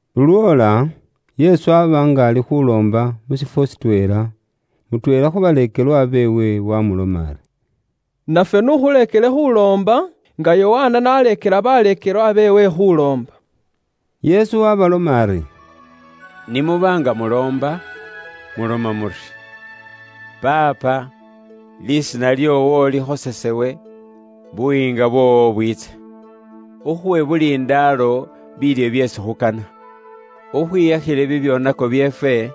Lulwoola, Yesu aba nga ali khuloomba mu shifwo shitweela, mutweela khu baleekelwa beewe wamuloma ari, “Nafwe n'ukhuleekele khuloomba nga Yokana n'aleekela baleekelwa beewe khuloomba.” Yesu waabaloma ari, “Ni muba nga muloomba, muloma muri, ‘Paapa, Khayo lisiina lyoowo likhosefu liisibwemo lukoosi, buyiinga bwoowo bwiitse. Ukhuwe buli ndaalo biilyo byeesi khukana. Ukhwiyakhile bibyoonako byeefwe,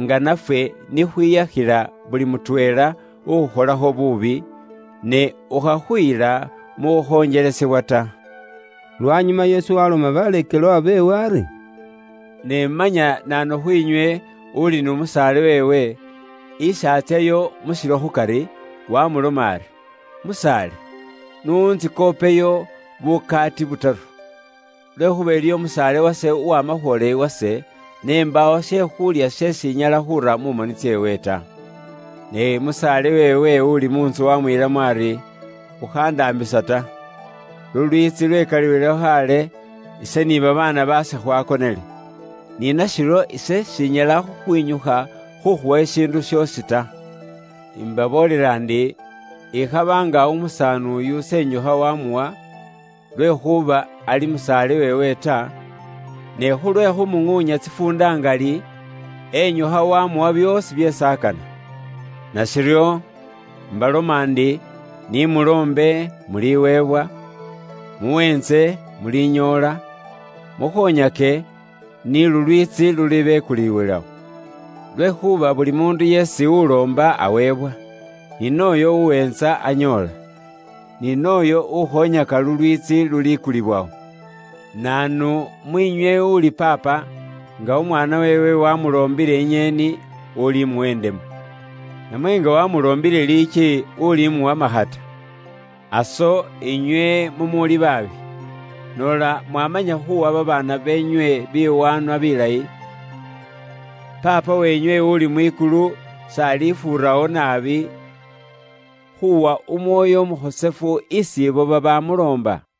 nga nafwe nikhwiyakhila buli mutweela ukhukholakho buubi, ne ukhakhuyila mu khukhonjelesebwa ta.’” Lwanyuma Yesu waloma baleekelwa beewe ari, “Ne manya naanu khwiinywe uli ni musaale weewe, isi atsyayo mu shilo khukari, wamuloma ari, ‘Musaale, n'untsikhopeyo bukaati butaru, lwekhuuba iliyo musaale wase uwama khwoola iwase, ne mbaawo she khuulya sheesi inyala khuura mu moni tseewe ta.’ Ne musaale weewe uli mu ntsu wamwiilamo ari, ‘Ukhandaambisa ta. Lulwiitsi lwekaliwilewo khaale, ise ni babaana baase khwakonele. Ni nashiryo ise shinyala khukhwinyukha khukhuwa shishiindu shoosi ta.’ Imbaboolela ndi, ikhaba nga umusaani uyu s'enyukha wamuwa, lwekhuuba ali musaale weewe ta, ne khulwe khumuŋuunya tsifuunda ngali, enyukha wamuwa byoosi byeesi akana. “Nashiryo, imbaloma ndi, ni muloombe muliweebwa; muweentse mulinyoola; mukhonyake ni lulwiitsi lulibekuliwilawo. Lwekhuuba buli muundu yeesi uloomba aweebwa; ni nooyo uweentsa anyoola; ni nooyo ukhonyaka lulwiitsi lulikulibwawo. Naanu mwiinywe uli paapa, nga umwaana weewe wamuloombile inyeeni, ulimuwa indemu? Namwe nga wamuloombile liiki, ulimuwa makhata? Aso, inywe mumuuli baabi, noola mwamanya khuuwa babaana beenywe biwaanwa bilayi, Paapa weenywe uli mwikulu s'alifuurawo naabi khuuwa Umwoyo Umukhosefu isi ibo babamuloomba?”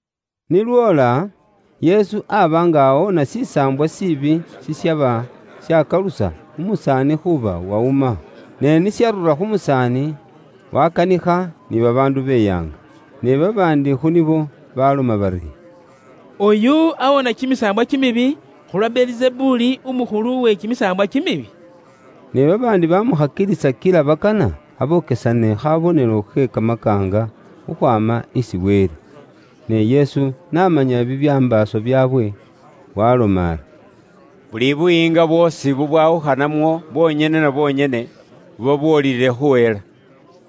Ni lwoola, Yesu aba nga awoona shisaambwa shiibi shishaba shakalusa umusaani khuuba wawuma. Ne ni sharura khu musaani, wakanikha, ni babaandu beyaanga. Ne babaandi khu nibo baloma bari; “Oyu awoona kimisaambwa kimibi, khulwa Belizebuli, umukhulu we kimisaambwa kimibi.” Ne babaandi bamukhakilisa kila bakana abokesane khabonelo khe kamakaanga khukhwaama mwikulu isi Wele. Ne Yesu n'amanya bibyambaaso byaabwe, waaloma ari, “Buli buyiinga bwoosi bubwawukhanamwo bwonyene na bwonyene, buba bwoolile khuhela,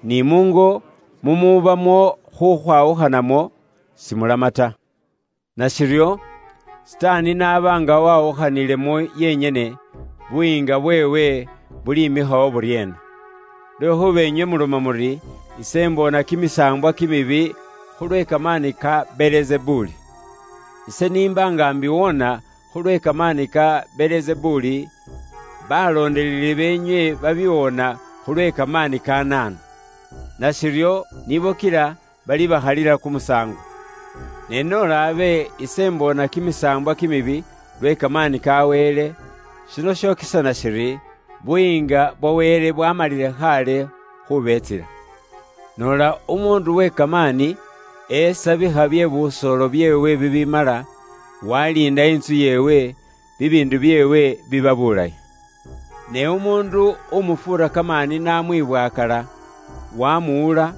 ni muungo mumubamo khukhwawukhanamo simulama ta. Nashiryo, Sitaani n'aba nga wawukhanilemo yenyene, buyiinga bweewe bulimikhawo buryeena? Lwekhuuba inywe muloma muri, ise mboona kimisaambwa kimibi khulwe kamaani ka Belizebuli. Ise n'imba nga mbiwoona khulwe kamaani ka Belizebuli, baloondeleli beenywe babiwoona khulwe kamaani ka naanu? Nashiryo, nibo kila balibakhalila kumusaango. Ne noola abe ise mboona kimisaambwa kimibi lwe kamaani ka Wele, shino shokesana shiri, Buyiinga bwa Wele bwa bwaamalile khaale khubeetsila. “Noola umuundu we kamaani, esabikha bye busoolo byeewe bibimala, waliinda lumako lweewe mu lukoosi, bibiindu byeewe biba byaliindibwile bulayi. Ne umuundu umufuura kamaani n'amwibwaakala, wamuwula,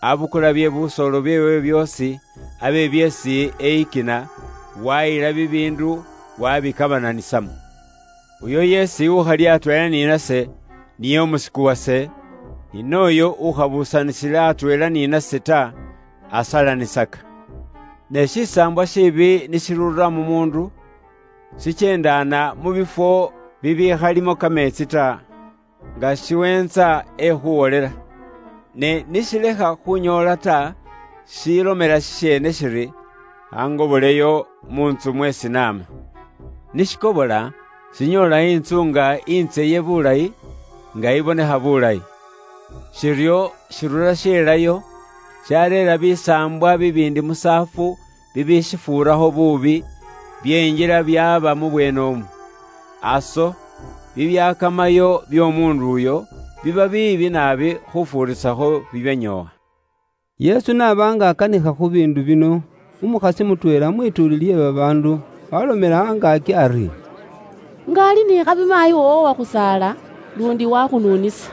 abukula bye busoolo byeewe byoosi, abe byeesi eyikina, wayila bibiindu wabikabananisamo. Uyo yeesi ukhali atweela ni nase, niye umusiku wase, ni nooyo ukhabuusanisila atweela ni nase ta, asalanisaka.” “Ne shisaambwa shiibi ni shirura mu muundu, shikyeendaana mu bifwo bibikhalimo kameetsi ta, nga shiweentsa ekhuwolela. Ne ni shilekha khunyoola ta, shilomela shisheene shiri; ‘Khangoboleyo mu ntsu mweesi naama.’ Ni shikobola, shinyoola intsu nga intseye bulayi, nga ibonekha bulayi. Shiryo shirura shelayo, shareera bisaambwa bibiindi musaafu bibishifuurakho buubi, byenjila byaaba mubweenemwo. Aso bibyakamayo by'omuundu uyo biba biibi naabi khufuurisakho bibyanyoowa.” Yesu n'aba nga akanikha khu biindu bino, umukhasi mutweela mwituuli lye babaandu waalomela angaaki ari, “Nga ali ni khabi maayi woowo uwakhusaala, luundi wakhununisa.”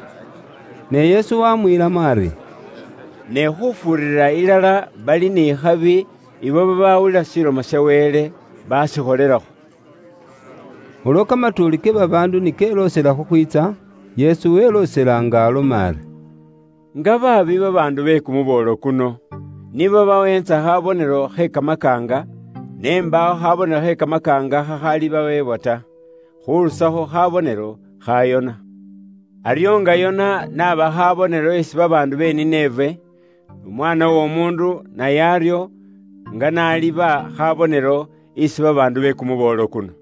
Ne Yesu waamwiilamo ari, “Ne khufuurira ilala bali ni khabi abo babaawulila Ilomo ya Wele, baakikholelakho.” Ulwo kamatuuli ke babaandu ni keloosela khukhwiitsa, Yesu weloosela nga aloma ari, “Nga baabi babaandu be kumuboolo kuno! Nibo baweentsa khabonelo khe kamakaanga, ne mbaawo khabonelo khe kamakaanga khakhalibaweebwa ta, khurusakho khabonelo kha Yona. Aryo nga Yona n'aba khabonelo isi babaandu be Nineve, n'Umwaana w'Omuundu naye aryo nga n'aliba khabonelo isi babaandu be kumuboolo kuno.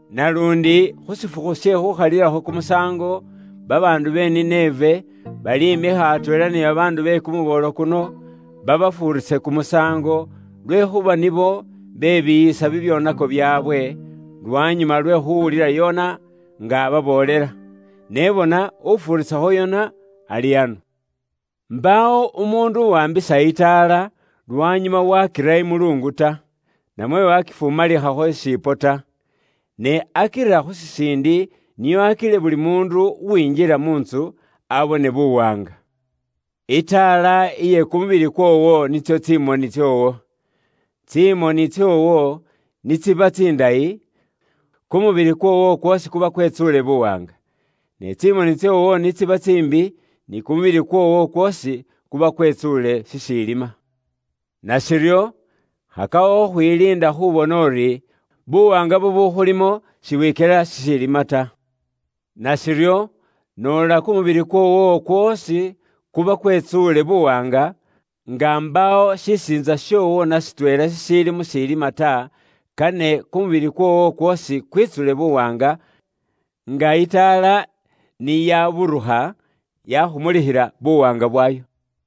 Naluundi khu shifukhu she khuukhalilakho kumusaango, babaandu be Nineve, balimikha atweela ni babaandu be kumuboolo kuno, babafuurise kumusaango, lwekhuuba nibo bebiiyisa bibyoonako byaabwe, lwanyuma lwe khuuwulila Yona nga ababoolela. Ne bona ufuurisakho Yona ali ano. “Mbaawo umuundu uwaambisa itaala, lwanyuma wakira imuluungu ta, namwe wakifumalikhakho shishipo ta. Ne akira khu shisiindi nio akile buli muundu uwinjila mu ntsu abone buwaanga. Itaala iye kumubili kwoowo nitso tsimoni tsoowo. Tsimoni tsoowo ni tsiba tsindayi, kumubili kwoowo kwoosi kuba kwetsuule buwaanga. Ne tsimoni tsoowo ni tsiba tsiimbi, ni kumubili kwoowo kwoosi kuba kwetsuule shishiilima. Nashiryo, khakakho khukhwiliinda khubona uri, buwaanga bubukhulimo, sibwikyela shishiilima ta. Nashiryo, noola kumubili kwoowo kwoosi kuba kwetsuule buwaanga, nga mbaawo shisiintsa shoowo na shitweela shishiili mu shilima ta, kane kumubili kwoowo kwoosi kwitsule buwaanga nga itaala ni yaburukha yakhumulikhila buwaanga bwayo”.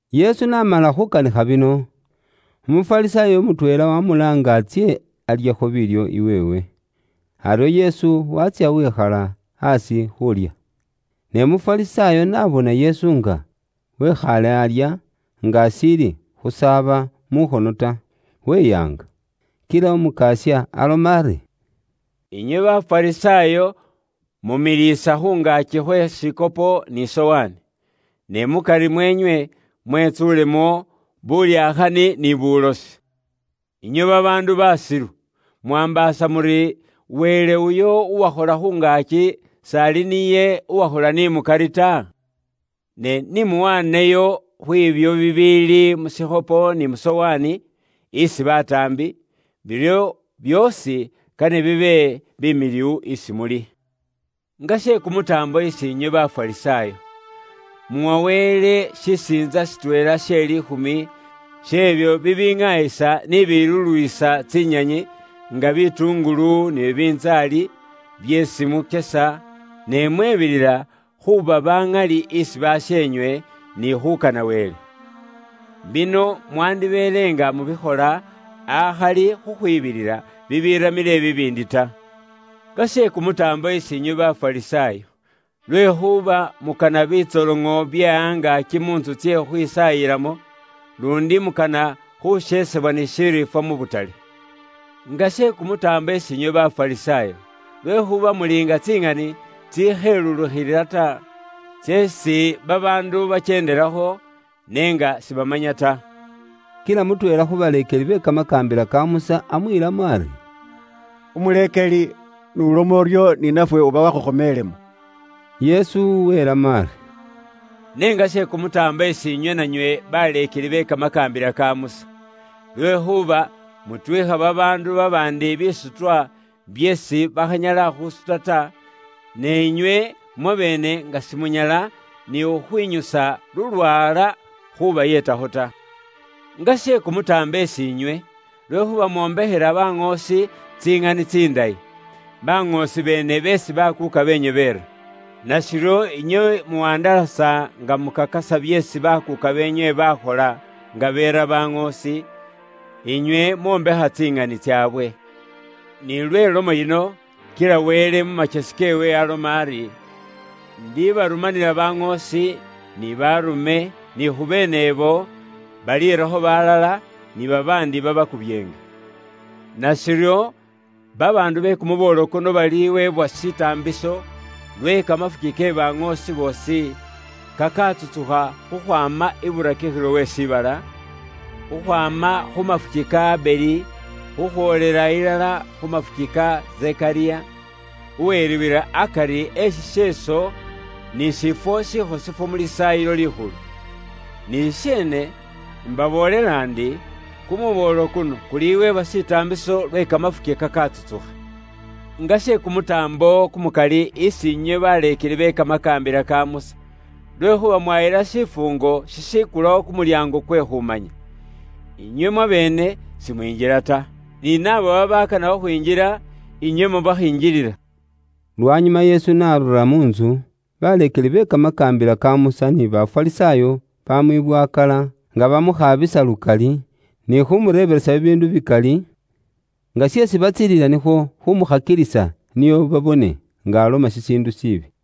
Yesu n'amala khukanikha bino, Umufarisaayo mutweela wamuloomba ari atsye alyekho biilyo iweewe. Aryo Yesu waatsya wikhala aasi khuulya. Ne Umufarisaayo n'abona Yesu nga wikhaale alya nga ashiili khusaaba mukhono ta, weyaanga. Kila Umukasya aloma ari, “Inywe Bafarisaayo mumiliisa khu ngaaki khwe shikhopo ni sowaani, ne mukari mweenywe mwetsuulemo bulyakhani ni bulosi. Inywe babaandu basilu, mwaambaasa muri Wele uyo uwakhola khu ngaaki s'ali niye uwakhola ni mukari ta? Ne ni muwaaneyo khwiibyo bibiili mu shikhopo ni mu sowaani, isi bataambi, biryo byoosi kane bibe bimiliwu isi muli. “Nga she kumutaambo isi inywe Bafarisaayo! Muwa Wele shisiintsa shitweela she liikhumi sh'ebyo bibiŋaayisa ni bibiluluwisa tsinyanyi nga bitungulu ni bibintsaali, byeesi mukyesa, ne mwebilila khuuba baŋali isi basheenywe, ni khuukana Wele. Bino mwandibeele nga mubikhola akhali khukhwibilila bibiramile bibiindi ta. “Nga she kumutaambo isi nywe Bafarisaayo! Lwekhuuba mukana bitsoloŋo bye angaaki mu ntsu tsye khukhwisaayilamo, luundi mukana khusheesebwa ni shiriifwa mu butale. Nga she kumutaambo isiinywe Bafarisaayo! Lwekhuuba muli nga tsiŋani tsikhelulukhilila ta, tseesi babaandu bakyeendelakho, ne nga sibamanya ta.” Kila mutweela khu baleekeli be kamakaambila ka Musa amwiilamo ari, “Umuleekeli n'uloma uryo, ni nafwe uba wakhukhomelemo.” Yesu wiilamo ari: “Ne nga she kumutaambo isi inywe nanywe baleekeli be kamakaambila ka Musa! Lwekhuuba mutwiikha babaandu babaandi bisutwa byeesi bakhanyala khusuta ta, ne inywe mwabeene nga simunyala ni khukhwinyusa lulwaala khubayeetakho ta. Nga she kumutaambo isi inywe! Lwekhuuba mwombekhela baŋoosi tsiŋani tsindayi, baŋoosi beene beesi bakuuka beenywe beera. Nashiryo inywe muwandalasa nga mukakasa byeesi bakuuka beenywe baakhola nga beera baŋoosi, inywe mwombekha tsiŋani tsaabwe. Nilwe lomo yino, kila Wele mu makyesi keewe aloma ari, ‘Ndibarumanila baŋoosi, ni baarume, ni khubeenebo, baliirakho balala, ni babaandi babakubyeenge.’ Nashiryo babaandu be kumuboolo kuno baliweebwa shitaambiso lwe kamafuki ke baŋoosi boosi kakatsutsukha khukhwaama iburakikhilo we shiibala, Kim 24.20,21khukhwaama khu mafuki ka Abeli, khukhwoolela ilala khu mafuki ka Zekariya, uweriibwila akari e shisheeso ni shifwo shikhosefu mu Lisaayilo Likhulu. Ni shisheene, imbaboolela ndi, kumuboolo kuno kuliweebwa shitaambiso lwe kamafuki kakatsutsukha. “Nga she kumutaambo kumukali isi inywe baleekeli be kamakaambila ka Musa! Lwekhuuba mwayila shifuungo shishikulawo kumulyaango kwe khumanya. Inywe mwabeene simwinjila ta, ni naabo babakana khukhwinjila, inywe mubakhingilila.” Lwanyuma Yesu n'arura mu ntsu, baleekeli be Kamakaambila ka Musa ni Bafarisaayo bamwibwakaala nga bamukhaabisa lukali, ni khumureebelesa bibiindu bikali, nga sheesi batsiililila nikhwo khumukhakilisa nio babone nga aloma shishiindu shiibi.